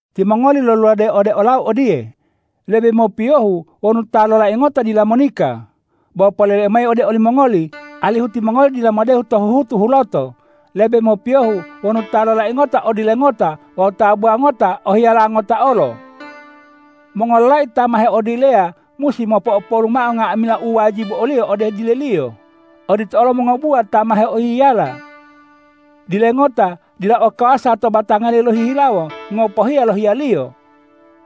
Timongoli loluladeyi ode olau odiye,”Lebe mopiyohu wonu ta lolai ngota dila monika.” Bo poleleu mayi ode olimongoli, alihu timongoli dila modehu to huhutu huloto: Lebe mopiyohu wonu ta lolai ngota o dile ngota wawu tabuwa ngota o hiyala ngota olo. Mongololai ta ma heodileya musi mopo'opolu mao nga'amila u wajibu oliyo ode dileliyo. Odito olo mongobuwa ta ma heohiyala. Dile ngota dila o kawasa to batangaliyo lohihilawo ngopohiya lo hiyaliyo.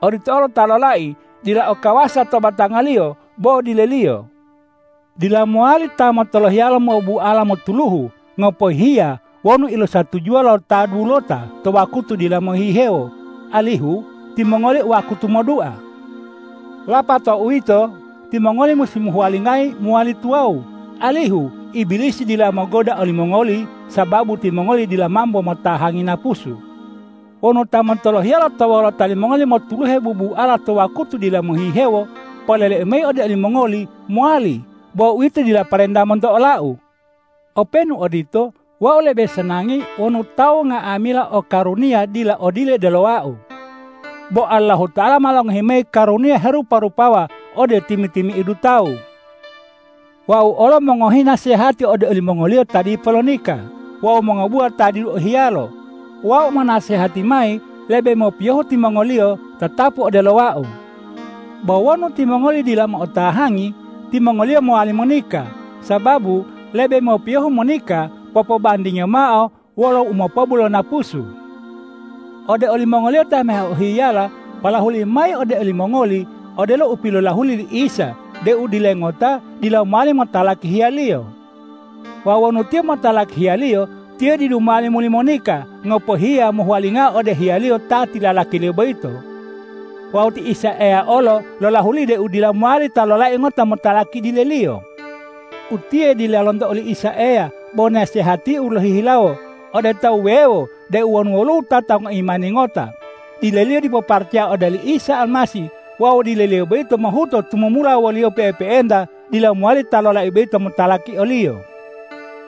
Odito olo ta lolai dila o kawasa to batangaliyo bo dileliyo. Dila mowali ta motolohiyalo mobuala motuluhu ngopohiya wonu ilosatujuwa lo ta dudulota to wakutu dila mohihewo, alihu timongoli o wakutu modua. Lapato uwito, timongoli musi mohuwalingayi mowali tuwawu, alihu Ibilisi dila mogoda olimongoli, sababu timongoli dila mambo motahangi napusu. Wonu ta motolohiyalo to wolota limongoli motuluhe bubuala to wakutu dila mohihewo, poleleu mayi ode olimongoli: Mowali, bo uwito dila parenta monto olau. Openu odito, wau lebe sanangi wonu tawu nga'amila o karuniya dila o dile odelo wau. Bo Allahuta'ala ma longohi mayi karuniya herupa-rupawa ode timi-timi'idu tawu. Wau olo mongohi nasehati ode olimongoliyo ta dipo lonika wawu mongobuwa ta didu ohiyalo. Wau monasehati mayi: Lebe mopiyohu timongoliyo tatapu odelo wau. Bo wonu timongoliyo dila mo'otahangi, timongoliyo mowali monika, sababu lebe mopiyohu monika popobandingiyo mao wolo umopobu lo napusu. Ode olimongoliyo ta ma heohiyala, polahuliu mayi ode olimongoli odelo u pilolahuli li Isa deu dile ngota dila mowali motalaki hiyaliyo. Wawu wonu tiyo motalaki hiyaliyo, tiyo didu mowali muli monika ngopohiya mohuwalingao ode hiyaliyo ta tilalakiliyo boyito. Wawu ti Isa Eya olo lolahuli deu dila mowali ta lolai ngota motalaki dileliyo. Utiye dila lonto oli Isa Eya bo nasehatiu lohihilawo ode tawu wuwewo deu wonu woluwo wutata ngoimani ngota, dileliyo dipo paracaya ode oli Isa Almasih wawu dileliyo boyito mohuto tumumula woliyo pe'epe'enta, dila mowali ta lolai boyito motalaki oliyo.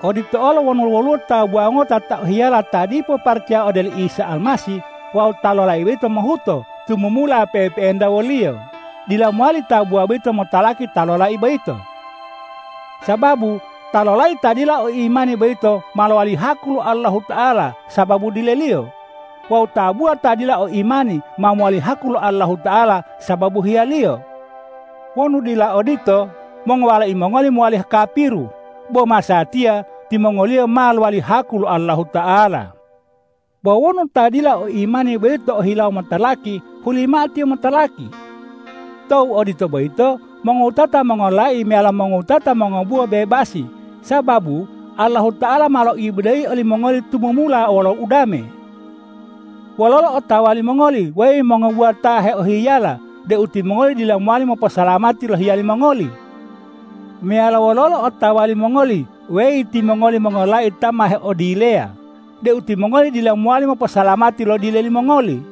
Odito olo wonu woluwo tabuwa ngota ta o hiyala ta dipo paracaya ode oli Isa Almasih wawu ta lolai boyito mohuto tumumula pe'epe'enta woliyo, dila mowali tabuwa boyito motalaki ta lolai boyito. Sababu ta lolai ta dila o imani boyito ma lowali haku lo Allahuta'ala sababu dileliyo; wawu tabuwa ta dila o imani ma mowali haku lo Allahuta'ala sababu hiyaliyo. Wonu dila odito, mongowalai mongoli mowali kapiru, bo masatiya timongoliyo ma lowali haku lo Allahuta'ala. Bo wonu ta dila o imani boyito ohilawo motalaki, huli mao tiyo motalaki. To u odito boyito, mongowutata mongololai meyalo mongowutata mongobuwa bebasi, sababu Allahuta'ala ma loibodeyi olimongoli tumumula wolo udame. Wololo otawa limongoli, weyi mongobuwa ta ma heohiyala, deu timongoli dila mowali moposalamati lo hiyali mongoli? Meyalo wololo otawa limongoli, weyi timongoli mongololai ta ma heodileya, deu timongoli dila mowali moposalamati lo dile limongoli?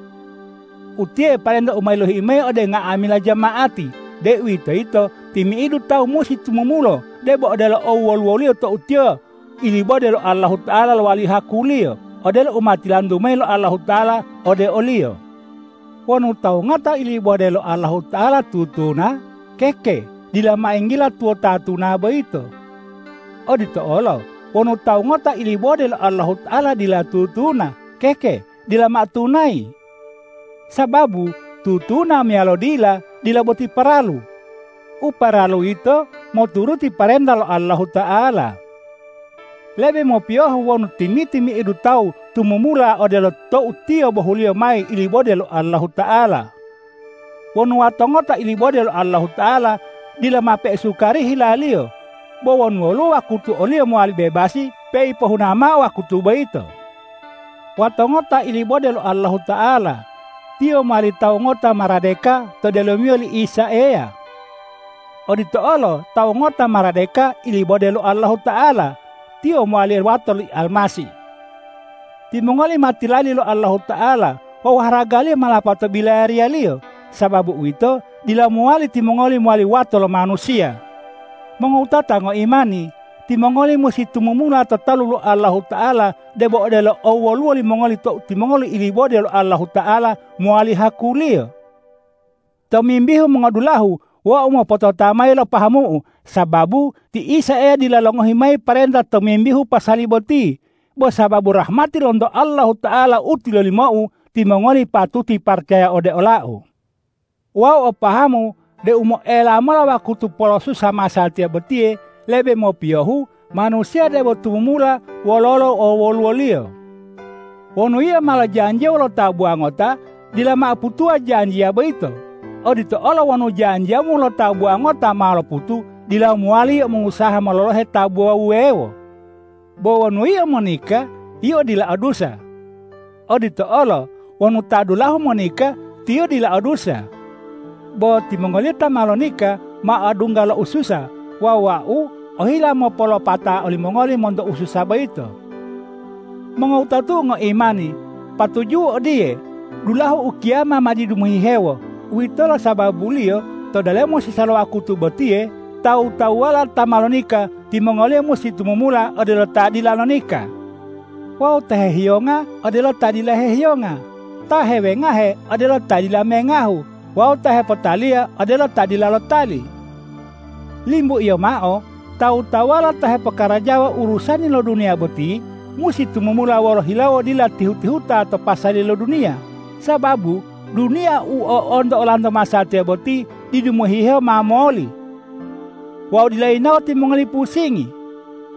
Utiye parenta u ma yilohiu mayi ode nga'amila jama'ati, deuwitoyito timi'idu tawu musi tumumulo debo odelo owoluwoliyo tou tiyo ilibode lo Allahuta'ala lowali haku-Liyo, odelo u ma tilantu mayi lo Allahuta'ala ode oliyo. Wonu tawu ngota ilibode lo Allahuta'ala tutuna, keke dila mao yinggila tuwoto tuna boyito. Odito olo wonu tawu ngota ilibode lo Allahuta'ala dila tutuna, keke dila mao tunayi. Sababu tutuna meyalo dila, dila boti paralu. U paralu yito moturuti parenta lo Allahuta'ala. Lebe mopiyohu wonu timi-timi'idu tawu tumumula odelo tou tiyo bohuliyo mayi ilibode lo Allahuta'ala. Wonu wato ngota ilibode lo Allahuta'ala, dila mao peisukari hilaliyo. Bo wonu woluwo wakutu oliyo mowali bebasi, peipohuna mao wakutu boyito. Wato ngota ilibode lo Allahuta'ala; tiyo mowali tawu ngota maradeka to delomiyo li Isa Eya. Odito olo tawu ngota maradeka ilibode lo Allahuta'ala; tiyo mowali wato le Almasih. Timongoli ma tilali lo Allahuta'ala wawu haragaliyo ma lapato bilayariya-Liyo. Sababu uwito, dila mowali timongoli mowali wato lo manusiya. Mongowutata ngoimani! Timongoli musi tumumula to talu lo Allahuta'ala debo odelo owoluwo limongoli tou timongoli ilibode lo Allahuta'ala mowali haku-Liyo. Tomimbihu mongodulahu, wau mopotota mayi lo pahamu'u, sababu ti Isa Eya dila longohi mayi parenta tomimbihu pasali boti. Bo sababu rahmati lonto Allahuta'ala u tilolimou, timongoli patuti paracaya ode olau. Wau o pahamu deu moela mola wakutu polosusa masatiya botiye, lebe mopiyohu manusiya debo tumumula wololo owoluwoliyo. Wonu yio ma lojanjiya wolo tabuwa ngota, dila mao putuwa janjiya boyito; odito olo wonu janjiyamu wolo tabuwa ngota ma loputu, dila mowali yio mongusaha mololohe tabuwa wuwewo. Bo wonu yio monika, yio dila o dusa. Odito olo wonu ta dulahu monika, tiyo dila o dusa. Bo timongoliyo ta ma lonika ma odungga lo ususa wawu wau ohila mopolopata olimongoli monto ususa boyito. Mongowutatu'u ngoimani, patuju'u odiye: Dulahu ukiyama ma didu mohihewo! Uwitolo sababuliyo to delomo sisa lo wakutu botiye tawu-tawuwala ta ma lonika, timongoliyo musi tumumula odelo ta dila lonika, wawu ta hehiyonga odelo ta dila hehiyonga, ta hewengahe odelo ta dila mengahu wawu ta hepotaliya odelo ta dila lotali. Limbuiyo mao tawu-tawuwala ta hepokarajawa urusani lo duniya boti, musi tumumula wolo hilawo dila tihu-tihuta to pasali lo duniya, sababu duniya u o'onto olanto masatiya boti didu mohihewo ma moli. Wau dila yinawo timongoli pusingi.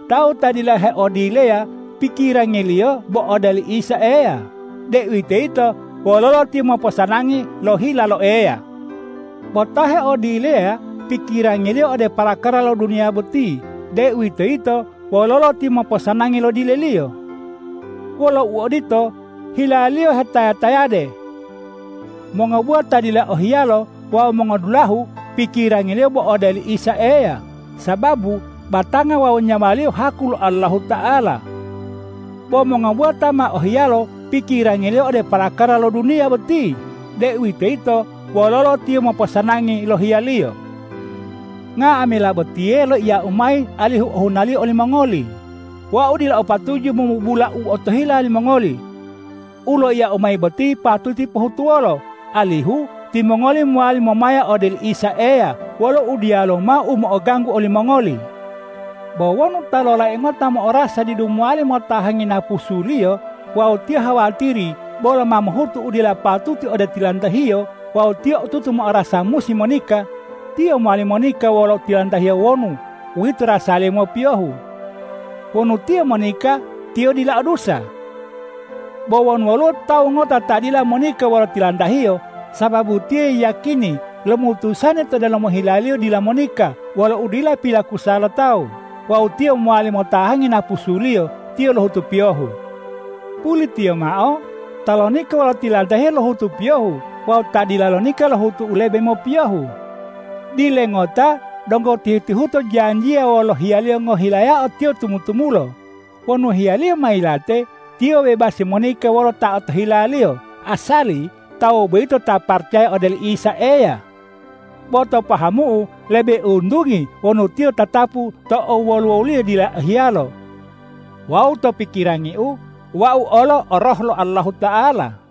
Tawu ta dila heodileya pikirangiliyo bo ode oli Isa Eya, deuwitoyito wololo tiyo moposanangi lo hila lo Eya. Bo ta heodileya pikirangiliyo ode parakara lo duniya boti, deuwitoyito wololo tiyo moposanangi lo dileliyo. Wolo uodito, hilaliyo hetaya-tayade. Mongobuwa ta dila o hiyalo wawu mongodulahu pikirangiliyo bo ode oli Isa Eya, sababu batanga wawu nyawaliyo haku lo Allahuta'ala. Bo mongobuwa ta ma o hiyalo pikirangiliyo ode parakara lo duniya boti, deuwitoyito wololo tiyo moposanangi lo hiyaliyo. Nga'amila botiye loiyau mayi alihu ohunaliyo olimongoli. Wau dila o patuju momubula u otohila limongoli. U loiyau mayi boti patuti pohutuwolo, alihu timongoli mowali momaya ode oli Isa Eya wolo u diyaluwo mao u mo'oganggu olimongoli. Bo wonu ta lolai ngota mo'orasa didu mowali motahangi napusuliyo wawu tiyo hawatiri bolo ma mohutu u dila patuti ode tilantahiyo wawu tiyo otutu mo'orasa musi monika, tiyo mowali monika wolo tilantahiyo wonu uwito rasaliyo mopiyohu. Wonu tiyo monika, tiyo dila o dusa. Bo wonu woluwo tawu ngota ta dila monika wolo tilantahiyo, sababu tiyo yiyakini lomutusani to delomo hilaliyo dila monika wolo udila pilakusa lo tawu wawu tiyo mowali motahangi napusuliyo, tiyo lohutu piyohu. Pulitiyo mao ta lonika wolo tilantahiyo lohutu piyohu wawu ta dila lonika lohutu u lebe mopiyohu. Dile ngota donggo tihu-tihuto janjiya wolo hiyaliyo ngohilayao tiyo tumu-tumulo. Wonu hiyaliyo ma yilate, tiyo bebasi monika wolo ta otohilaliyo, asali tawu boyito ta paracaya ode oli Isa Eya. Bo to pahamu'u, lebe untungi wonu tiyo tatapu to owoluwoliyo dila o hiyalo. Wawu to pikirangiu, wau olo o Roh lo Allahuta'ala.